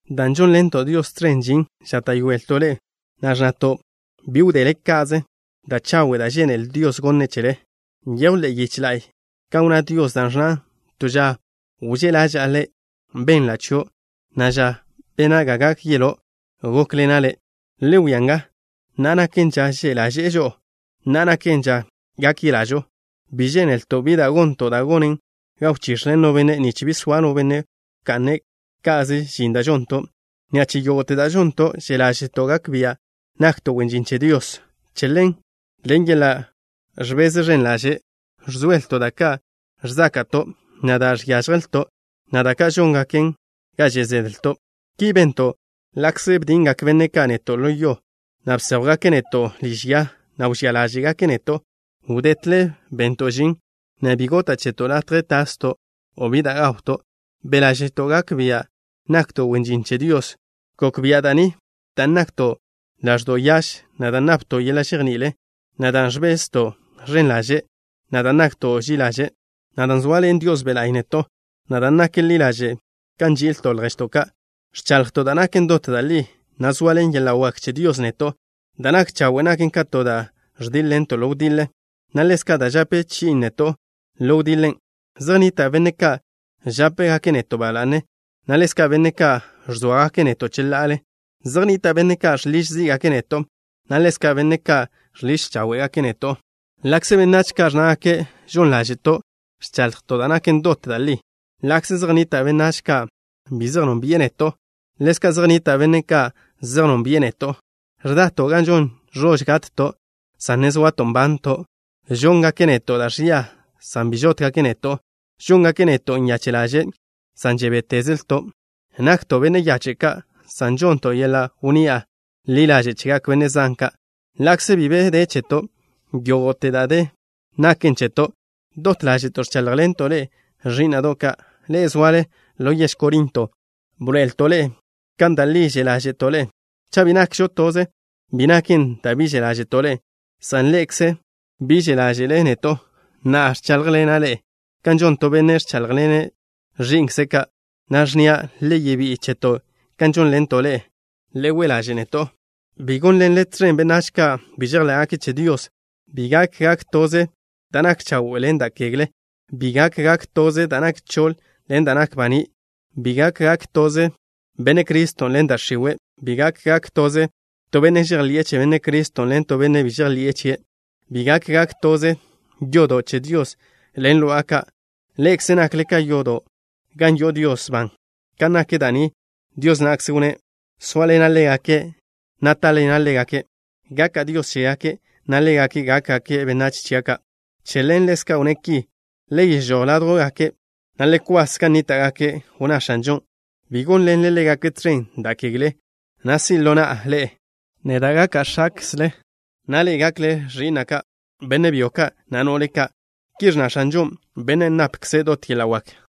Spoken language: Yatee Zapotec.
Dan' žónḻento' Dios tẕen žin, žáta'yoelto' ḻe'e, na' ẕnnato' bi wdele ka'ze da' chawe' da' žénele Dios gone' chele. Nyejw ḻe'e yiche la'y kan wnná Dios, da' ẕnnan: To ža wžé' ḻaža'a le', benla' chio', na' ža bena' ga gak yeló', gókḻena' le'. Le wia nga. Na'a naken ža že' ḻaže'e žo'o. Na'a naken ža gak yelažo. Bi žénelto' bi da' gonto' da' gonen ga wchix̱le no benne', nich bi soa no benne' wka'ne' ka'ze žin da' žonto'. Ni'a che yógo'te da' žonto', že' ḻáže'to' gak bia' nakto' wen žin che Dios. Che ḻen, ḻen yeḻa' ẕbeze ẕen ḻaže' ẕzoelto' da' ka' ẕzáka'to', na' da' ka' žiážjelto', na' da' ka' žóngaken ga že' zedlto'. Ki bento' ḻa'kze bdingak benne' ka' neto' ḻo yo, na' bséjwgake' neto' liž ya, na' wžía ḻáže'gake' neto'. Wdetle bento' žin, na' bi gota' cheto' latje tasto' o bi da' gawto'. Be' ḻáže'to' gak bia' nakto' wen žin che Dios. Gok bia' da' ni dan' nakto' ḻaẕdo' yaž, na' dan' napto' yeḻa' žejní'il, na' dan' ẕbezto' ẕen ḻaže', na' dan' nakto' ži'i ḻaže', na' dan' zoaḻen Dios Be' La'y neto', na' dan' nak ḻi ḻaže' kan nži'ilto' lježto' ka'. Ẕchaḻjto' da' naken dot da' li, na' zoaḻen yeḻa' wak che Dios neto'. Da' nak chawe' naken ka to da' ẕdíḻ-ḻento' ḻo wdiḻe, na' ḻezka' da' žape chi'in neto' ḻo wdiḻen'. Zej nnita' benne' ka' žápegake' neto' ba la'ne, na' ḻezka' benne' ka' ẕzóagake' neto' cheḻa'ale. Zej nnita' benne' ka' žḻiž zí'gake' neto', na' ḻezka' benne' ka' žḻiž cháwe'gake' neto'. Ḻa'kze benách ka' ẕnnágake' žon ḻáže'to', ẕchaḻjto' da' naken dot da' li. Ḻa'kze zej nnita' benách ka' bi zej nónbi'e neto', ḻezka' zej nnita' benne' ka' zej nónbi'e neto'. Ẕdato' gan žon ẕož gatto', san ne zoato' nbanto'. Žóngake' neto' da' ẕia, san bi žótgake' neto'. Žóngake' neto' nyache' ḻaže', san žebétezelto'. Nakto' benne' yache' ka', san žonnto' yeḻa' wnni'a ḻi ḻaže' chegak benne' zan ka'. Ḻa'kze bi be de cheto', yógo'te da' de naken cheto'. Dot ḻáže'to' ẕcháḻjḻento' ḻe'e, ẕí'na'do' ka', ḻe'e zoale ḻo yež Corinto. Bḻoe'elto' ḻe'e kan da' li že' ḻáže'to' ḻe'e. Cha' bi nakžo toze bi naken dan' bi že' ḻáže'to' ḻe'e, san ḻe'ekze bi že' ḻáže'le neto'. Na'a, ẕcháḻjḻena' ḻe'e kan žon to benne' ẕcháḻjḻene' ẕi'nkze' ka', na' ẕnnia': le yebí'i cheto' kan žónḻento' ḻe'e. Le we' ḻaže' neto'. Bi gónḻenle tẕen benách ka' bi žejḻé'gake' che Dios. Bi gak gak toze da' nak chawe' ḻen da' kegle. Bi gak gak toze da' nak choḻ ḻen da' nak baní'. Bi gak gak toze Benne' Criston' ḻen da' x̱iwe'. Bi gak gak toze to benne' žejḻi'e che Benne' Criston' ḻen to benne' bi žejḻi'e chie'. Bi gak gak toze yodo' che Dios ḻen lo'a ka'. Ḻe'ekze nakle ka to yodo' gan yo'o Dios ban. Kan nak da' ni, Dios na'kze wnné': Sóaḻena' ḻégake', na' táḻena' ḻégake'. Gaka' Dios chégake', na' ḻégake' gákgake' benách chia' ka'. Che ḻen, ḻezka' wnné' ki: Le yežój ládjwgake', na' le kwas gan nníta'gake'. Wnná X̱anžo: “Bi gónḻenle ḻégake' tẕen da' kegle, na' si' ḻo na'a ḻe'e. Neda' gaka' X̱akzle, na' ḻe'e gakle ẕi'na' ka', benne' byo ka', na' no'le ka'.” Ki ẕnna X̱anžo, Bennen' napkze' dot yeḻa' wak.